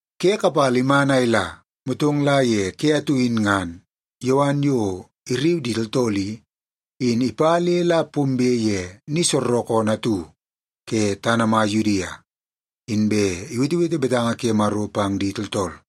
Ke kapala iman a ila, motong la ye ke atu in ngan Yowan yo irriu di tooltool i, in ipa le la pombe ye ni soorookoonoo atu ke tana mai Yudia, inbe iwetewete betanga ke Maro pang di tooltool.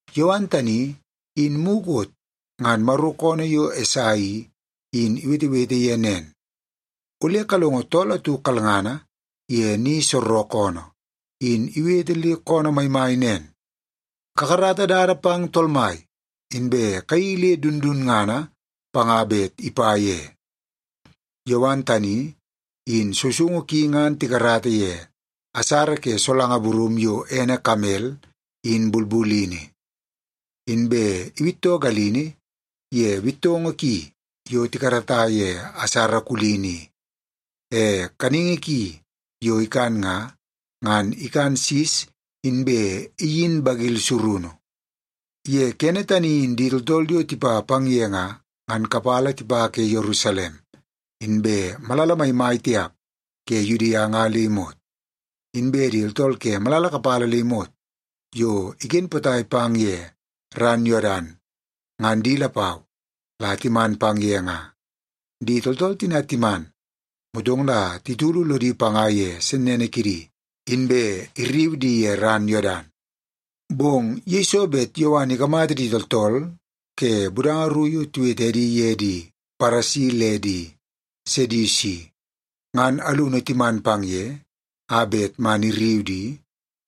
Yowan tani, in mukot ngan Maro koonoo yo Esai i, in iwetewete ye nen, “Ole kalongo tool atu kalngana ye ni soorookoonoo, in iwete le koonoo maimai nen, ‘Kakarata dada pang Tool Mai, inbe kayeii le dundunngana panga bet ipa ye.’” Yowan tani in sousoungu ki ngan tikarata ye asara ke solanga burum yo ene kamel in bulbulini. Inbe iwittoo galini ye bittoongoo ki yo tikarata ye asara kulini i. E kaningi ki yo ikan nga, ngan ikan sis inbe iyin bagil surunu. Ye kene tani in di tooltool yo tipa pang ye nga, ngan kapala tipa ke Yerusalem, inbe ke malala maimai tiap ke Yudia nga le imot. Inbe di tooltool ke malala kapala le imot yo iken potai pang ye ran Yodan, ngan di lapau la timan pang ye nga. Di tooltool tina timan, motong la titulu lodi panga ye sennene kidi, inbe irriu di ye ran Yodan. Bong yeiso bet Yowan ikamata di tooltool ke budanga ru yo tiwete edi ye di Paresi le di Sedusi, ngan alunu timan pang ye a bet man irriu di,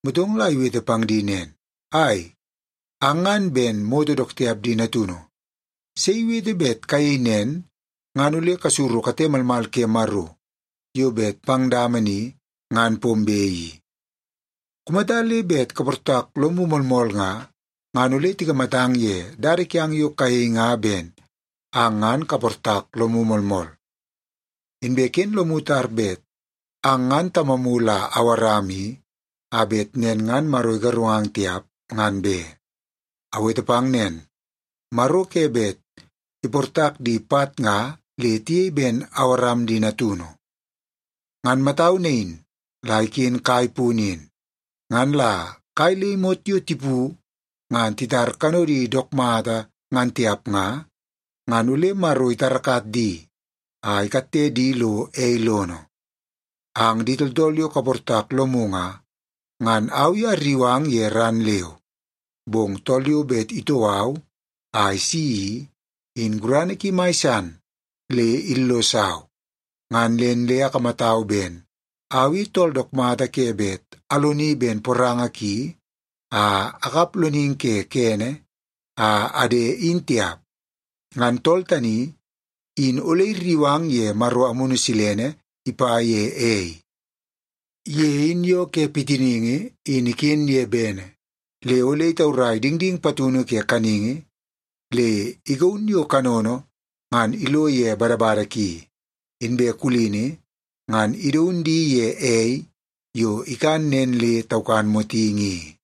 motong la iwete pang di nen, “Ai, ang ngan ben moto dook tiap di natunu! Sei iwete bet kayei nen ngan ole kasuru kate malmal ke Maro yo bet pang dama ni ngan pombe i? Kumata le bet kaportak lomu moolmool nga, ngan ole tikamatang ye dada kiang yo kayei nga ben ang ngan kaportak lomu moolmool. Inbe ken lomu tar bet ang ngan tamamu la Awaram i, a bet nen ngan Maro igarungang tiap, ngan be. Awete pang nen, Maro ke bet iportak di pat nga le tiyei ben Awaram di natunu. Ngan matau nain la iken kai punu in. Ngan la kai le imot yo tipu ngan titar kanodi dook mata ngan tiap nga, ngan ole Maro itarakat di a ikatte di lo ei lono. “Ang di tooltool yo kaportak lomu nga, ngan au i arriu ang ye ran leu. Bong tool yo bet itoo au a isi i, in gurana ki mai san le illosau. Ngan nen le akamatau ben au i tool dook mata ke bet aloni ben poranga ki a akap loningi ke kene a ade in tiap. Ngan tool tani in ole irriu ang ye Maro Amunu Silene ipa ye ei. Ye in yoo ke pitiningi in iken ye bene, le ole itaurai dingding patunu ke kaningi le igaun yo kanono ngan ilo ye badabada ki, inbe kulini ngan idaun di ye ei yo ikan nen le taukan motingi i.”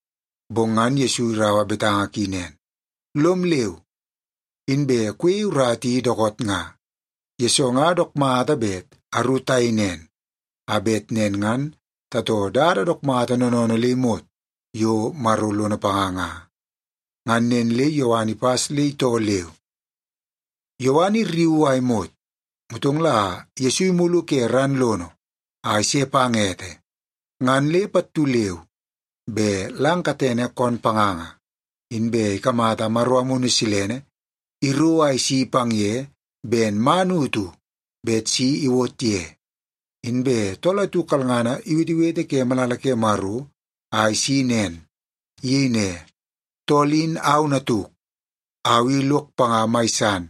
Bong ngan Yesu iraua betanga ki nen, “Lom leu, inbe kuyei urata i dookoot nga, yesoo nga dook mata bet aru tayei nen, a bet nen ngan tatoo dada dook mata noonoonoo le imot yo Maro lono panga nga.” Ngan nen le Yowan ipas le itoo leu. Yowan irriuu a imot, motong Yesu imulu ke ran lono a ise pang ete, ngan pattu leu be lang katene koon panganga, inbe ikamata Maro Amunu Silene iro a isi pang ye ben man utu bet si iwot ye. Inbe tool atu kalngana iwetewete ke malala ke Maro a isi nen. Iyei ne, “Tool in au natuk. Au i lok panga mai san,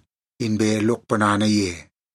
inbe lok ponana ye.”